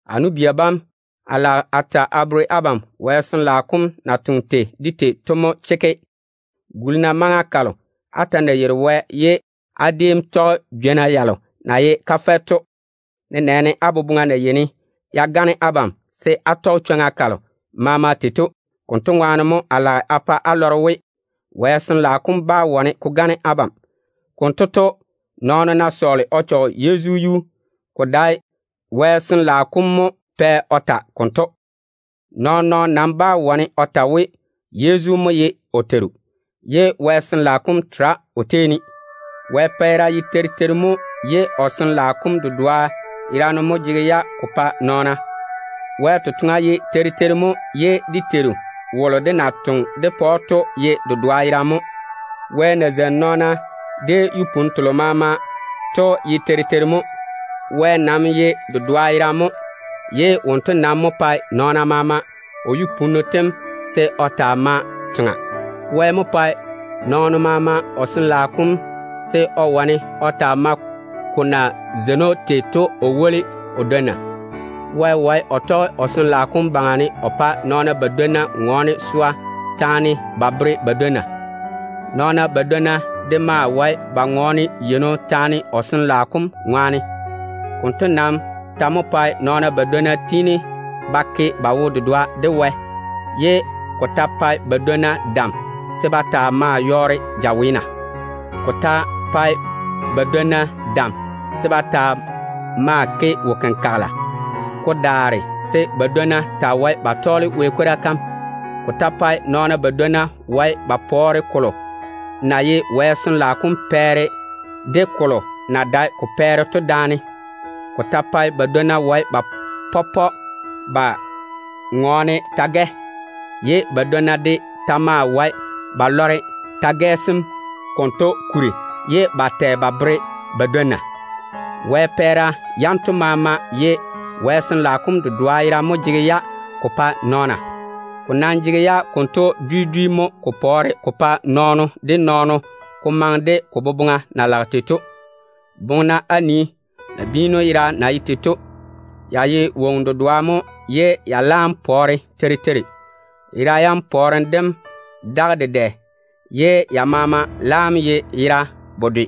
A nu-bia bam, a lage a ta a bere abam Wɛ Sin-laao kom na toŋe tei de tei to mo chekke. Guli-na maŋa kalo á ta na yeiri Wɛ ye á déem tɔge jwo-yɔɔro to, nenɛɛne á boboŋa na yeini ya gane abam se á sa chwoŋa tei to. Konto ŋwaane mo a lage a pa á lɔre we, Wɛ Sin-laao kom bá wane ko gane abam. Konto to, nɔɔno ná sɔɔle o chɔge Yezu yuu, ko dae Wɛ Sin-laao kom mo pɛ o ta konto. Nɔɔn-nɔɔno nam bá wane o ta we, Yezu mo ye o Teiru, ye Wɛ Sin-laao kom tere o tei ne. Wɛ pɛɛra ye teiri teiri mo, ye o Sin-laao kom dedoa yerane mo jege-ya ko pae nɔɔna. Wɛ totoŋa ye teiri teiri mo, ye dé Teiru wolo dé na toŋe dé pa‑o to ye dedoa yerane mo. Wɛ na zeini nɔɔna de yu-punnu telo maama to ye teiri teiri mo. Wɛ nam ye dedoa yerane mo, ye wonto nam mo pae nɔɔno maama o yu-punnu tem se o taa maa toŋa. Wɛ mo pae nɔɔno maama o Sin-laao kom se o wane o taa tɔge ko zeinim baŋa ne o woli o dwonna. Wɛ wae o tɔge o Sin-laao kom baŋa o pa nɔɔna badwonna ŋɔɔne swa taane ba bere ba dwonna. Nɔɔna badwonna de maa wae ba ŋɔɔne yeino taane o Sin-laao kom ŋwaane. Konto nam ta mo pae nɔɔna badwonna yɔɔre ba ke ba wo-dedoa de Wɛ, ye ko ta pae badwonna dam se ba taa maa yɔɔre jaweena. Ko ta pae badwonna dam se ba taa maa ke wo-kenkagela, ko daare se badwonna taa wae ba tɔɔle Wɛ kwora kam. Ko ta pae nɔɔna badwonna wae ba pɔɔre Wɛ Sin-laao kom totoŋa de chichiri totoŋa daane. Ko ta pae badwonna wae ba ŋɔɔne ta-gɛ dwi dwi, ye badwonna de ta maa wae ba tɛ ta-gɛ sem konto kuri ba bere ba dwonna. Wɛ pɛɛra yanto maama ye Wɛ Sin-laao kom dedoa yerane mo jege-ya ko pae nɔɔna. Ko nam jege-ya konto dwi dwi mo ko pɔɔre ko pae nɔɔno de nɔɔno, se ko maŋe de ko boboŋa na jaane tei to. Boŋe-na á nii nabiinu yera na ye tei to. Ya ye woŋo dedoo mo ye ya laam pɔɔre teiri teiri. Yera yam pɔɔrem dem daga dedɛ ye ya maama laam ye yera bedwe.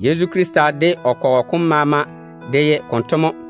Yezu Krista de o kɔgɔ kom maama de ye konto mo.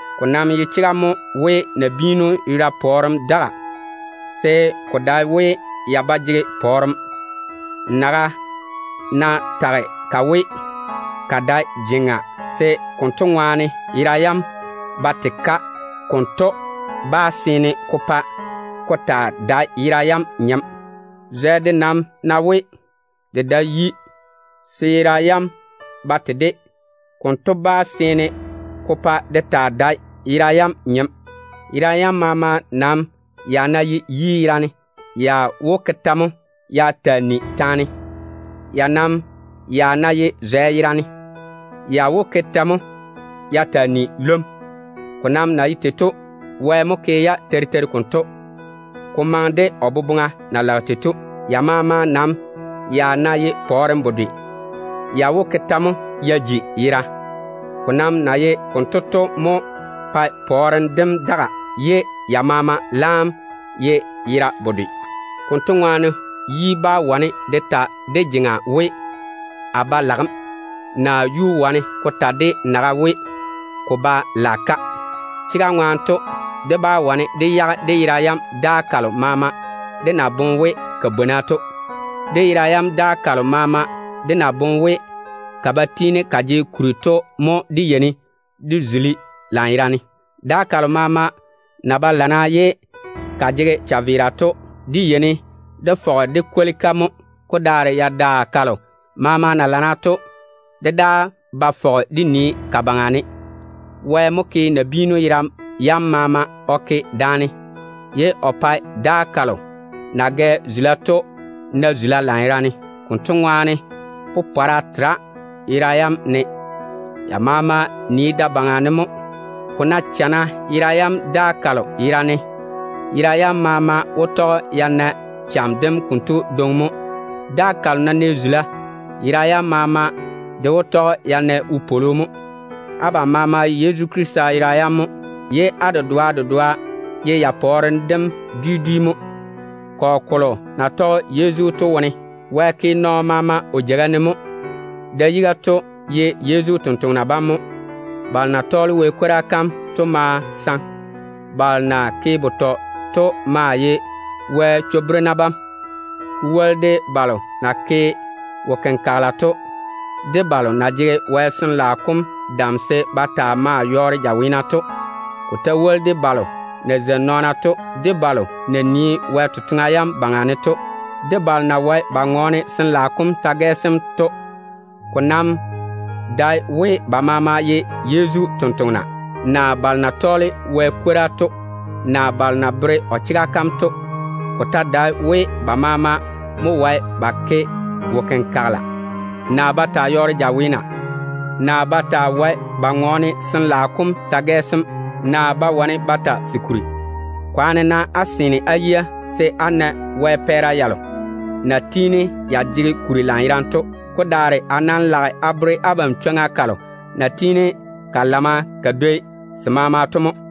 Ko nam ye chega mo we nabiinu yera pɔɔrem daga, se ko dae we ya ba jege pɔɔrem. Naga ná tage ka we, ka dae jeŋa, se konto ŋwaane yera yam ba tei-ka, konto bá seene ko pa ka ta dae yera yam nyem. Zwɛ de nam ná we, de dae yi, se yera yam ba tei-de, konto bá seene ko pa de ta dae yera yam nyem. Yera yam maama nam ya ná ye yi yerane, ya wó ke tɛ mo ya taa ni taane? Ya nam ya ná ye zwɛ yerane, ya wó ke tɛ mo ya taa ni lwom? Ko nam na ye tei to, Wɛ mo ke-ya teiri teiri konto, ko maŋe de o boboŋa na lage tei to. Ya maama nam ya ná ye pɔɔrem bedwe, ya wó ke tɛ mo ya ji yera? Ko nam na ye konto to mo pae pɔɔrem dem daga ye ya maama laam ye yera bedwe. Konto ŋwaane, yi bá wane de ta de jeŋa we, “A ba lage‑m”. Yuu de ba jege chwoŋa se ko ta de naga we, ko ba lage-ka. Chega ŋwaane to, dé bá wane dé dole dé yage dé yera yam daa kalo maama dé na pae ka bwona to. Ko nam ná ye dé yera yam daa kalo maama dé na boŋe we ka ba tiini ka jege kuri to mo, dé yeini dé zuli-ka lanyerane. Daa kalo maama na ba lana ye ka jege chaveera to, dé yeini dé fɔge dé kwoli-ka mo. Ko daare dé yera yam daa kalo maama na lana to, dé daa ba fɔge dé nii ka baŋa ne. Wɛ mo ke nabiinu yera yam maama o ke daane, ye o pae daa kalo ya na gɛ zula to na zula lanyerane. Konto ŋwaane popɔra tera yera yam wone. Ya maama nii da-baŋa ne mo. Ko ná chana yera yam daa kalo yera ne, yera yam maama wó tɔge ya na cham dem konto dwoŋi mo. Daa kalo ná nɛ zula, yera yam maama de wó tɔge ya na wopwolo mo. Abam maama ye Yezu Krista yera yam mo, ye á dedoa dedoa ye ya pɔɔrem dem dwi dwi mo. Kɔgɔ kolo na tɔge Yezu to wone, Wɛ ke nɔɔno maama o jeiga ne mo. Da-yiga to ye Yezu totoŋa nakwa mo. Balo na ye Wɛ ni-jwoŋina to maa saŋe. Balo na ke betɔ to maa ye Wɛ chwo-berena bam. Ko woli de balo na ke wo-kenkagela to, de balo na jege Wɛ Sin-laao kom dam se ba taa maa yɔɔre jaweena to. Ko ta woli de balo na zeini nɔɔna to, de balo na nii Wɛ totoŋa yam baŋa ne to, de balo na wae ba ŋɔɔne Sin-laao kom ta-gɛ dwi dwi to. Ko nam dae we abam maama ye Yezu totoŋa nakwa, naa Wɛ ni-jwoŋina, naa balo na bere o chega kam to. Ko ta dae we abam maama mo wae á ke wo-kenkagela, naa á ta‑á yɔɔre jaweena, naa á wae á ŋɔɔne Wɛ Sin-laao kom ta-gɛ sem, naa á wae á tɛ se kuri. Nam kwaane-na á seene á yia se á na Wɛ pɛɛra yalo na tiini ya jege kuri lanyerane to. Ko daare a nam lage a bere abam chwoŋa kalo na tiini ka lana ka dwoi maama to mo.